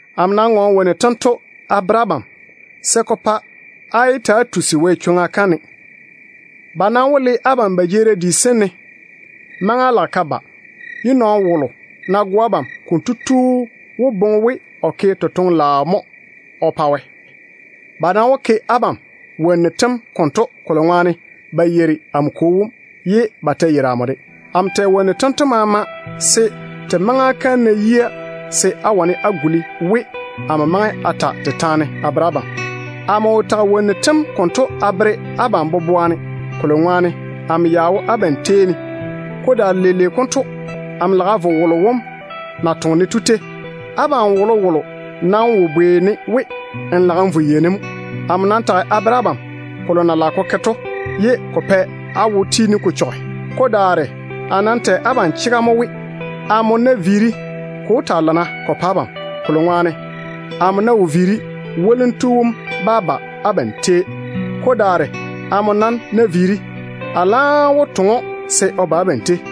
“Amo nam ŋɔɔne wonnu tento a bere abam se ko pa á yé ywori Wɛ chwoŋa kam ne. Ba nam wó le abam ba jeerim di sem ne. Maŋa lage ka ba ye nɔɔno wolo ná go abam, kotu wó boŋe we o ke totoŋ-laao mo o pa Wɛ. Ba nam wó ke abam wonnu tem konto, kolo ŋwaane ba yeiri amo Kwo wom, ye ba ta yeiri amo de. Amo tɛ wonnu tento maama se te maŋa kam ná yia, se á wane á guli we amo maŋe a ta te taane a bere abam. Amo wo tage wonnu tem konto a bere abam boboa ne, kolo ŋwaane amo ya ta wo abam tei ne mo. Ko daare leile konto amo lage a vo wolo wom na toŋe-ne to tei. Abam wolowolo nam wo bwei-ne we, ‘Nmo lage n vo yei ne mo?’ Amo nam tage a bere abam kolo na lage ko ke to, ye ko pa á wo tiini ko chɔge. Ko daare a laam tɛ abam chega mo we, amo ná viiri, ko wó taa lana ko pa abam. Kolo ŋwaane amo ná wo viiri, Zeinnu wom bá ba abam tei. Amo nam ná viiri, a laam wó toŋe‑o se o ba abam tei.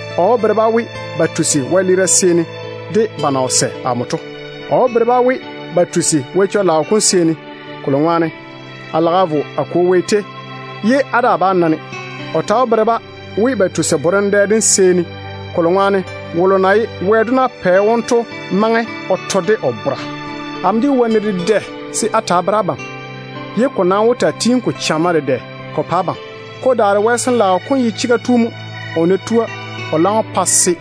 O wó bere-ba we ba tusi wɛleera seeni de ba na wo sɛ amo to mo. O ta wó bere-ba we ba tusi Wɛ chega kam seeni, kolo ŋwaane a lage a vo a Kwo Wɛ tei, ye á daa bá na-ne. O ta wó bere-ba we ba tusi Wɛ borem dem seeni, kolo ŋwaane logo baŋa dedɛɛro wom maŋe o to de o bora. Amo ya ta jege wonnu dedɛ se a ta a bere abam, ye te nam wó taa tiini te chamma te dwoi á jaanem. Ko daare Wɛ Sin-laao kom ye chega tu mo. O ná tua, o laam wó pa se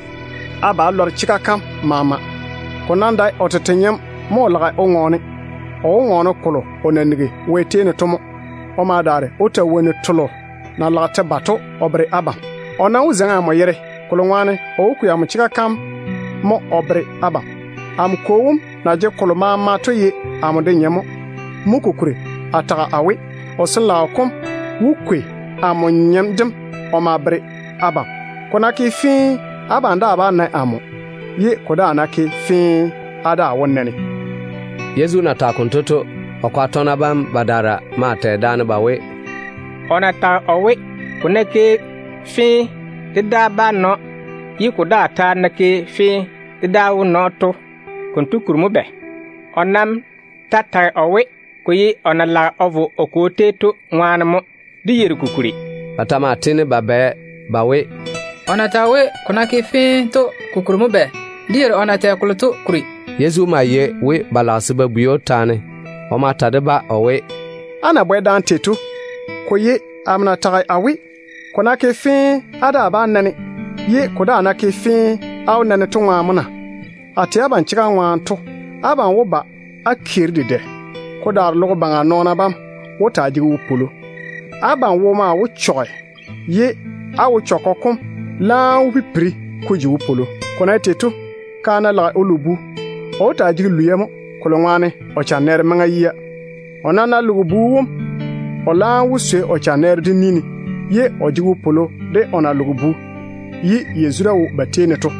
á ba á lɔre chega kam maama. Ko nam dae o tete nyem mo o lage o ŋɔɔne. O wó ŋɔɔne kolo o na nigi Wɛ tei ne to mo, o ma daare o ta wonnu telo na lage te ba to o bere abam. O nam wó pa amo na zula, kolo ŋwaane o wó kwei amo chega kam mo o bere abam. Amo Kwo wom na jege kolo maama to ye amo de nyem mo. Mo kokuri a tage a we, o Sin-laao kom wó kwei amo nyem dem o ma bere abam. Ko ná ke fee, abam daa bá na amo, ye ko daa ta ná ke fee ko woli da, á daa wó jwoori á na-ne.” Yezu na tage konto to, o kwaga tɔgena badaara maa tɛ daane ba we, “O na tage o we, ko ná ke fee dé daa bá na‑o, ye ko daa ta ná ke fee, dé daa wó na‑o to, konto kuri mo bɛ? O nam ta tage o we, ko ye o na lage o vo o Kwo tei to ŋwaane mo. Dé yeiri ko kuri.” Ba ta maa tiini ba bwɛ daane ba we, “O na tage o we, ‘ko ná ke fee’ to, ko kuri mo bɛ? Dé yeiri o na tɛ kolo to kuri.” Yezu ma lɔre we ba lage se ba bwei‑o taane. O ma ta de-ba o we, “Á na bwɛ daane tei to, ko ye amo na tage a we, ‘ko ná ke fee á daa bá na-ne, ye ko daa ná ke fee, á wó na-ne’ to ŋwaane mo na? A tɛ abam chega ŋwaane to, abam wó ba á keeri dedɛ wo-chechɔgɔ ŋwaane. Ko daare logo baŋa nɔɔna bam wó taa jege wopwolo. Abam wo maa wó chɔge, ye á wo-chechɔgɔ kom laam wó pipiri ko ji wopwolo. Ko na ye tei to, kaane ná lage o lo bu, o wó taa jege lwia mo, kolo ŋwaane o chanɛɛre maŋa yia. O nam ná loge bu wom, o laam wó swei o chanɛɛre dem ni ne, ye o wó taa jege wopwolo de o na loge bu wom to.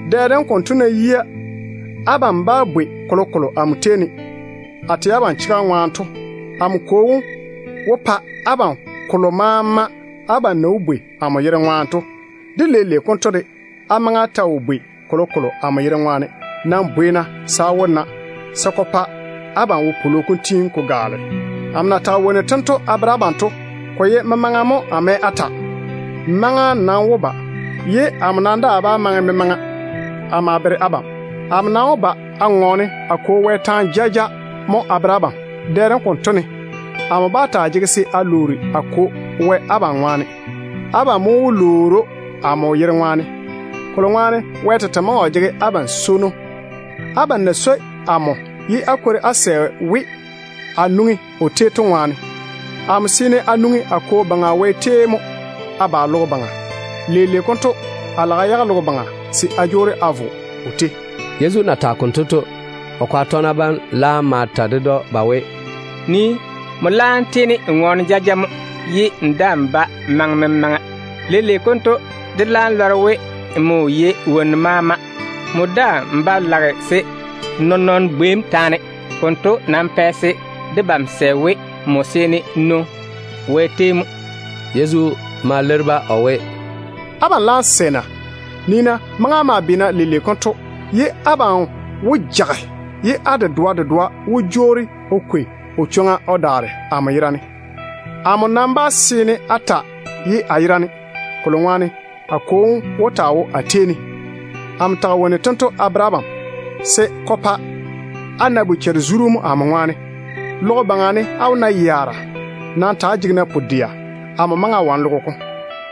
Dɛ dem konto ná yia, abam bá bwei kolokolo amo tei ne. A tɛ abam chega ŋwaane to, amo Kwo wom wó pa abam kolo maama abam na wó lwoori amo yere ŋwaane to. De leile konto de, á maŋe á ta wo lwoori kolokolo amo yere ŋwaane. Nam lwoori-na, se á wó na, se ko pa abam wopwolo kom tiini ko gaale. Amo na tage wonnu tento a bere abam to, ko ye memaŋa mo a mɛ a ta. Maŋa nam wó ba ye amo daa bá maŋe memaŋa a ma bere abam. Amo nam wó ba a ŋɔɔne a Kwo Wɛ taane jaja mo a bere abam. Dɛ dem konto ne, amo daa bá taa jege se a lwoori a Kwo Wɛ abam ŋwaane. Abam mo wó lwoori‑o amo yere ŋwaane, kolo ŋwaane Wɛ tete maŋe o jege abam swono, abam na swoi amo ye á kwori á sɛ we a nwoŋi o tei ne to ŋwaane. Amo seene a nwoŋi a Kwo Baŋa Wɛ tei mo a ba logo baŋa. Leile konto a lage a yage logo baŋa se a jwoori a vo o tei.” Yezu na tage konto to, o kwaga tɔgena bam laam ma ta ded‑o ba we, “Nii, nmo laam tiini n ŋɔɔne jaja mo, ye n daa‑n ba maŋe memaŋa. Leile konto dé laam lɔre we nmo yei wonnu maama. Nmo daa‑n ba lage se nɔɔn-nɔɔno bwei‑m taane. Konto nam pɛ se debam sɛ we, nmo seene n nwoŋi Wɛ tei mo.” Yezu ma leiri-ba o we, “Abam laam sɛ na? Nii-na, maŋa lage ka yi leile konto, ye abam wó jage. Abam dedoa dedoa maa wó jwoori o kwei o chwoŋa o daare amo yerane. Amo nam bá taa ye a yerane, kolo ŋwaane a Kwo wom wó taa wo a tei ne. Amo tage wonnu tento a bere abam se ko pa á na bochare-zuru mo, á na me de amo to ŋwaane. Logo baŋa ne á wó na yaara. Nam ta‑á jege-na pu-dɛa. Amo maŋe a wane logo kom baŋa maama.”